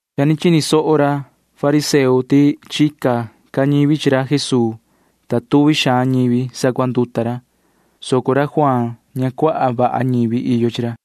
Cha chini soho ra fariseo ti chica ca ñivi chi ra Jesuu, ta cuaha suhva ñivi sacuanduta ra, soco ra Juaan ña cuaha vaha ñivi iyo chi ra.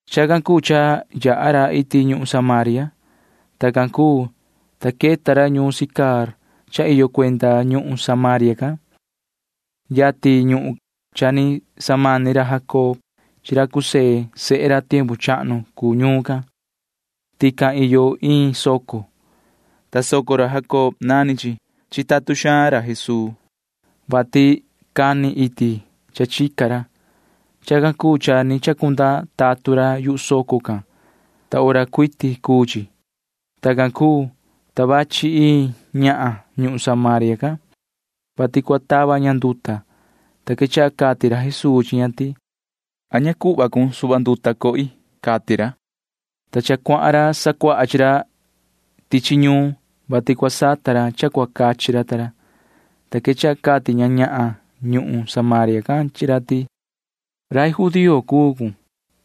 Chacan cuu cha yaha ra iti ñuhun Samaria. Tacan cuu, ta queta ra ñuun Sicar cha iyo cuenda ñuhun Samaria can. Yatin ñuhun cha ni samani ra Jacob chi ra José sehe ra tiempu chahnu cuu ñuun can. Tican iyo iin soco, ta soco ra Jacob nani chi. Chitatun ra Jesuu, vati cani iti cha chica ra. Chacan cuu cha ni chacunda tatun ra yuhu soco can, ta hora cuiti cuu chi. Tacan cuu, ta vachi iin ñahan ñuhun Samaria can, vati cua canihin ña nduta, ta quechaha cati ra Jesuu chi ña ti: ―Cuhva suhva nduta cohi ―cati ra. Cha ni cuahan ra sacuaha chi ra tichi ñuun, vati cua sata ra cha cua cachi ra ta ra, ta quechaha cati ña Samaria can chi ra ti: ―Rai judío cuun,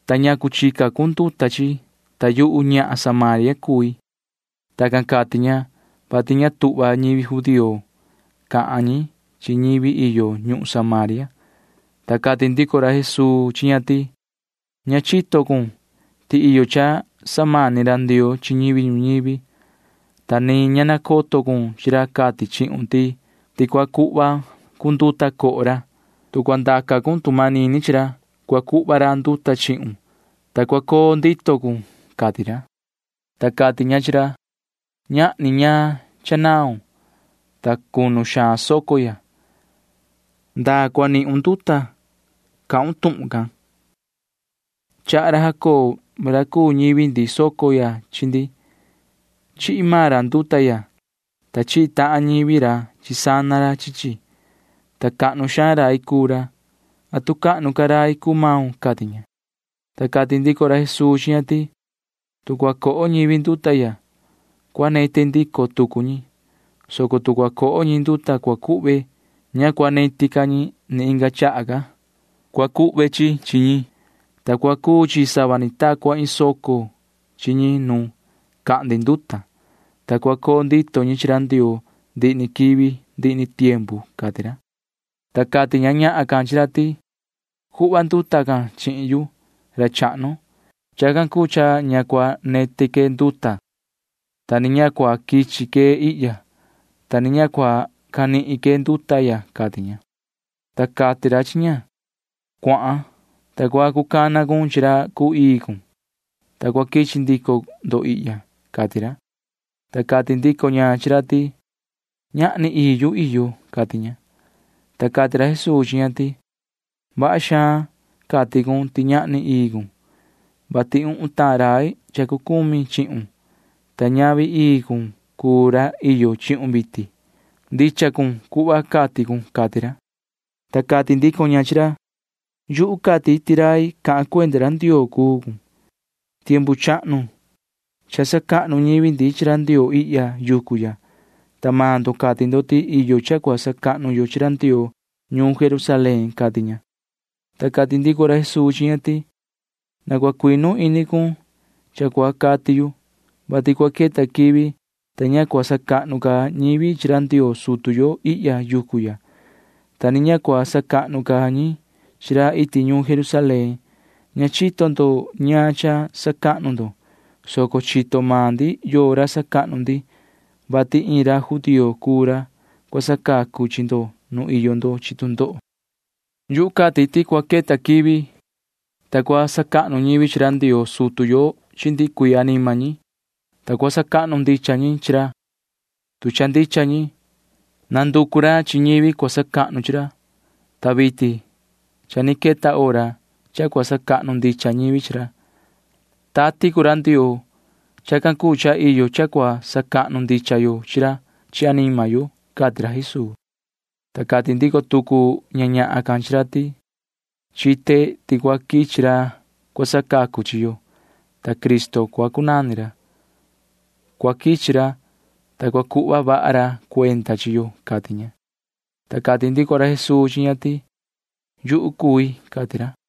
ta ¿ñacu chica cun nduta chi yuhu, ta yuhu ñahan Samaria cui? [Tacan cati ña, vati ña tuhva ñivi judío cahan ñi chi ñivi iyo ñuhun Samaria.] Ta cati ndico ra Jesuu chi ña ti: ―Ña chito cun ti iyo cha samani ra Ndioo chi ñivi ñuñivi, ta ni ña nacoto cun chi ra cati chihun ti cua cuhva cun nduta coho ra. Tu cua ndaca cun tu manini chi ra, cua cuhva ra nduta chihun, ta cua coo ndito cun ―cati ra. Ta cati ña chi ra: ―Ñahni ñaan cha naun, ta cunu xaan soco ya. ¿Ndaa cua nihun nduta cahun tuhun can? Chaha ra Jacob ra cuu ñivi ndi soco ya chi ndi. Chihi maan ra nduta ya, ta chihi tahan ñivi ra chi sana ra chi chi, ta cahnu xaan rai cuu ra. ¿Atu cahnu ca rai cuu maun? ―cati ña. Ta cati ndico ra Jesuu chi ña ti: ―Tu cua coho ñivi nduta ya, cua neti ndico tucu ñi, soco tu cua coho ñivi nduta cua cuhve, ña cua neti ca ñi ndihi ni quivi. Cua cuhve chi chi chi ñi, ta cua cuu chi sava ni ta cua iin soco chi ñi nu cahndi nduta, ta cua coo ndito ñi chi ra Ndioo ndihi ni quivi ndihi ni tiempu ―cati ra. Ta cati ña ñahan can chi ra ti: ―Cuhva nduta can chihin yu, ra chahnu. Chacan cuu cha ña cua neti que nduta, ta ni ña cua quichi que ihya, ta ni ña cua canihin que nduta ya ―cati ña. Ta cati ra chi ña: ―Cuahan, ta cua cana cun chi ra cuu ii cun, ta cua quichi ndico ndo ihya ―cati ra. Ta cati ndico ña chi ra ti: ―Ñahni ii yu iyo ―cati ña. Ta cati ra Jesuu chi ña ti: ―Vaha xaan cati cun ti ñahni ii cun, vati uhun tahan rai cha cucumi chihun, ta ñavi ra ii cun cuu ra iyo chihun vitin. Ndicha cun cuhva cati cun ―cati ra. Ta cati ndico ña chi ra: ―Yuhu cati ti rai cahan cuenda ra Ndioo cuun. Tiempu chahnu cha sacahnu ñivi ndi chi ra Ndioo ihya yucu ya, ta maan ndo cati ndo ti iyo cha cua sacahnu yo chi ra Ndioo ñuun Jerusalén ―cati ña. Ta cati ndico ra Jesuu chi ña ti: ―Na cua cuinu ini cun cha cua cati yu, vati cua queta quivi, ta ña cua sacahnu ca ñivi chi ra Ndioo sutu yo ihya yucu ya, ta ni ña cua sacahnu ca ñi chi ra iti ñuun Jerusalén. Ña chito ndo ñaan cha sacahnu ndo, soco chito maan ndi yoo ra sacahnu ndi, vati iin ra judío cuu ra cua sacacu chi ndo nu iyo ndo chi tu ndoho. Yu cati ti cua queta quivi, ta cua sacahnu ñivi chi ra Ndioo sutu yo chi ndihi cuii anima ñi, ta cua sacahnu ndicha ñi chi ra, tu cha ndicha ñi. Nanducu ra chi ñivi cua sacahnu chi ra, ta vitin cha ni queta hora cha cua sacahnu ndicha ñivi chi ra. Tati cuu ra Ndioo. Chacan cuu cha iyo cha cua sacahnu ndicha yo chi ra chi anima yo ―cati ra Jesuu. Ta cati ndico tucu ña ñahan can chi ra ti: ―Chite ti cua quichi ra cua sacacu chi yo, ta Cristo cua cunani ra. Cua quichi ra, ta cua cuhva vaha ra cuenda chi yo ―cati ña. Ta cati ndico ra Jesuu chi ña ti: ―Yuhu cui ―cati ra.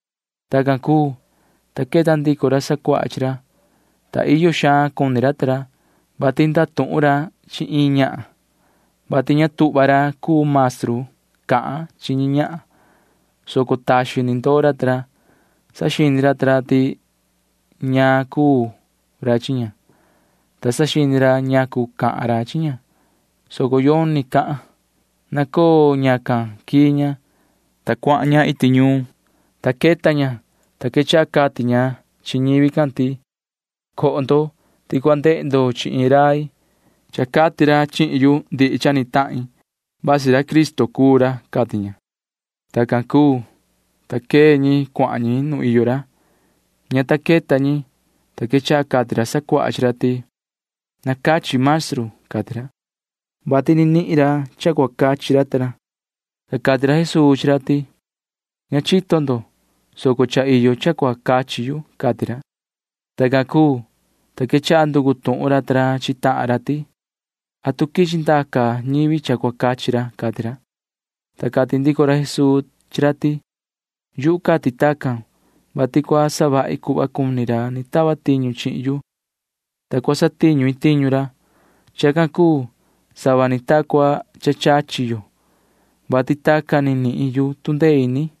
Tacan cuu, ta queta ndico ra sacuaha chi ra, ta iyo xaan cuni ra ta ra, vati ndatuhun ra chi iin ñahan, [vati ña tuhva ra cuu maestru cahan chi ñi ñahan,] soco taxin ni ndoo ra ta ra. Saxini ra ta ra ti ñaan cuu ra chi ña, ta saxini ra ñacu cahan ra chi ña, soco yoni cahan. Nacoo ñacan quii ña, ta cuahan ña iti ñuun, ta queta ña, ta quechaha cati ña chi ñivi can ti: ―Coho ti cua ndehe ndo chi iin rai. Cha cati ra chihin yu ndihi cha ni tahin. Vasi ra Cristo cuu ra ―cati ña. Tacan cuu, ta quee ñi cuahan ñi nu iyo ra. Ña ta queta ñi, ta quechaha cati ra sacuaha chi ra ti: ―Na cachi, maestru ―cati ra, [vati ni nihin ra cha cua cachi ra ta ra]. Ta cati ra Jesuu chi ra ti: ―Ña chito ndo, soco iyo cha cachi yu ―cati ra. Tacan cuu, ta quechaha nducu tuhun ra ta ra chi tahan ra ti: ―¿Atu quichi ndaca ñivi cha cua cachi ra? ―cati ra. Ta cati ndico ra Jesuu chi ra ti: ―Yu cati tacan, vati cua savahi cuhva cuni ra ni tachi chihin yu, ta cua satiñu i tiñu ra. [Chacan cuu sava ni ta cua cha chachi yo, vati tacan ni nihin yu tu ndee ini yu.]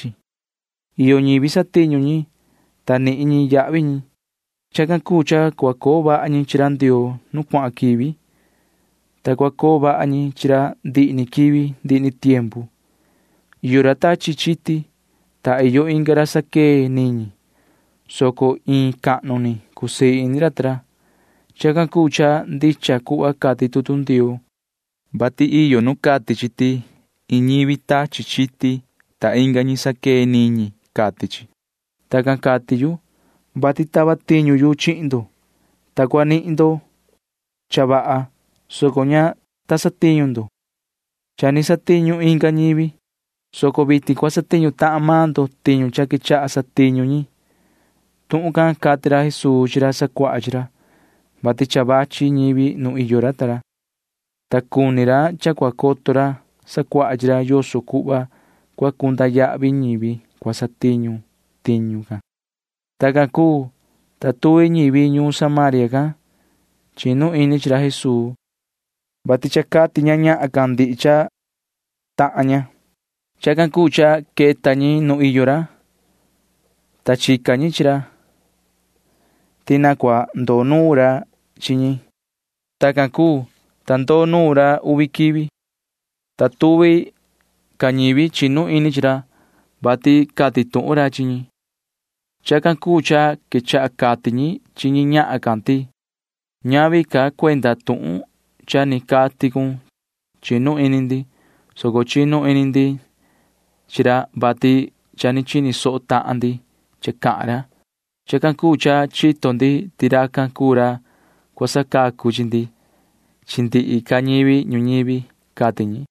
Cha iyo ñivi satiñu ñi, ta nihin ñi yahvi ñi. Chacan cuu cha cua coo vaha ñi chi ra Ndioo nu cuahan quivi, ta cua coo vaha ñi chi ra ndihi ni quivi ndihi ni tiempu. Iyo ra tachi chiti, ta iyo inga ra saquee niñi, soco iin cahnu ni cusii ini ra ta ra. Chacan cuu cha ndicha cuhva cati tutu Ndioo, vati iyo nu cati chi ti iin ñivi tachi chiti, ta inga ñi saquee niñi, cati chi. Tacan cati yu, vati tava tiñu yu chihin ndo, ta cua nihin ndo cha vaha, soco ña ta satiñu ndo. Cha ni satiñu inga ñivi, soco vitin cua satiñu tahan maan ndo tiñu cha quechaha satiñu ñi. Tuhun can cati ra Jesuu chi ra sacuaha chi ra, [vati cha vachi ñivi nu iyo ra ta ra, ta cuni ra cha cua coto ra sacuaha chi ra yoso cuhva cua cunda yahvi ñivi cua satiñu tiñu can]. Tacan cuu, ta tuvi ñivi ñuun Samaria can chinu ini chi ra Jesuu, vati cha cati ñahan can ti cha cati ra ndihi cha ni tahan ña. Chacan cuu cha queta ñi nuun iyo ra, ta chica tuhun ñi ti na cua ndoo nuun ra chi ñi. Tacan cuu, ta ndoo nuun ra uvi quivi, ta tuvi ca ñivi chinu ini chi ra, vati cati tuhun ra chi ñi. Chacan cuu cha quechaha cati ñi chi ña ñahan can ti: ―Ñavi ca cuenda tuhun cha ni cati cun chinu ini ndi, soco chinu ini ndi chi ra, vati cha ni chini soho tahan ndi cha cahan ra. Chacan cuu cha chito ndi ti racan cuu ra cua sacacu chi ndi chi ndihi ca ñivi ñuñivi ―cati ñi.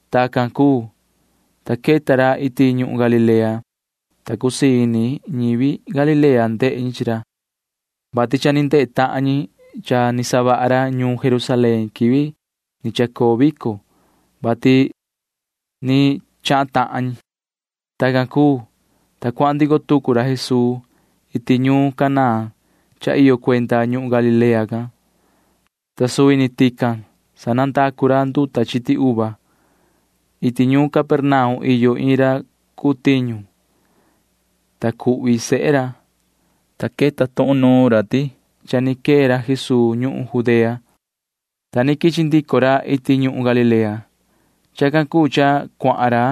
Tacan cuu, ta queta ra iti ñuhun Galilea, ta cusii ini ñivi Galilea ndehe ñi chi ra, vati cha ni ndehe tahan ñi cha ni savaha ra ñuun Jerusalén quivi ni chacoo vico, vati ni chahan tahan ñi. Tacan cuu, ta cuahan ndico tucu ra Jesuu iti ñuun Caná cha iyo cuenda ñuhun Galilea can, ta suvi ni tican sanandacu ra nduta chiti uva. Iti ñuun Capernaum iyo iin ra cuu tiñu, ta cuhvi sehe ra, ta queta tuhun nuun ra ti cha ni quee ra Jesuu ñuhun Judea, ta ni quichi ndico ra iti ñuhun Galilea. Chacan cuu cha cuahan ra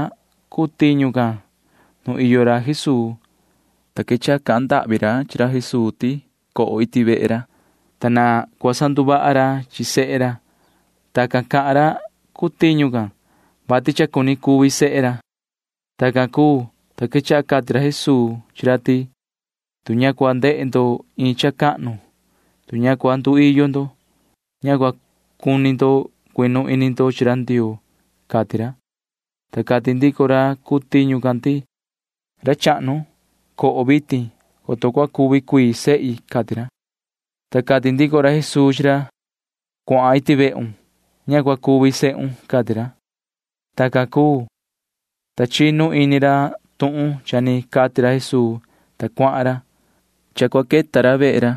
cuu tiñu can nu iyo ra Jesuu, ta quechaha cahan ndahvi ra chi ra Jesuu ti na coho iti vehe ra, ta na cua sanduvaha ra chi sehe ra. Tacan cahan ra cuu tiñu can, vati cha cuni cuvi sehe ra. Tacan cuu, ta quechaha cati ra Jesuu chi ra ti: ―Tu ña cua ndehe ndo iin cha cahnu, tu ña cua nduiyo ndo suhva, ña cua cuni ndo cuinu ini ndo chi ra Ndioo ―cati ra. Ta cati ndico ra cuu tiñu can ti: ―Ra chahnu, na coho vitin, coto cua cuvi cuii sehi ―cati ra. Ta cati ndico ra Jesuu chi ra: ―Cuahan iti vehun. Ña cua cuvi sehun ―cati ra. Tacan cuu, ta chinu ini racan tuhun cha ni cati ra Jesuu, ta cuahan ra. Cha cua queta ra vehe ra,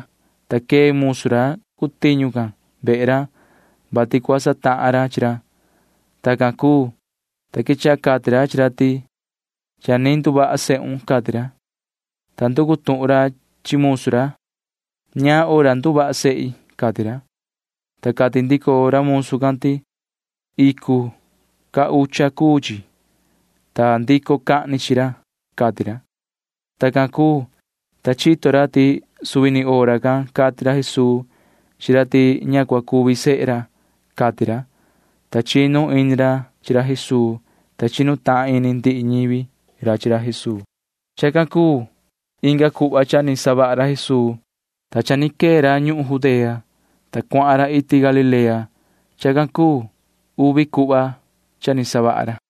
ta quee musu ra cuu tiñu can vehe ra, vati cua satahan ra chi ra. Tacan cuu, ta quechaha cati ra chi ra ti: ―Cha ni nduvaha sehun ―cati ra. Ta nducu tuhun ra chi musu ra: ―¿Ñaan hora nduvaha sehi? ―cati ra. Ta cati ndico musu ra ti: ―Icu ta hora cuu chi, ta ndico cahni chi ra ―cati ra. Tacan cuu, ta chito ra ti suvi ni hora can cati ra Jesuu chi ra ti ña cua cuvi sehe ra, cati ra, ta chinu ini ra chi ra Jesuu, ta chinu tahan ini ndihi ñivi ra chi ra Jesuu. Chacan cuu inga cuhva cha ni savaha ra Jesuu, ta cha ni quee ra ñuhun Judea, ta cuahan ra iti Galilea. Chacan cuu uvi cuhva cha ni savaha ra.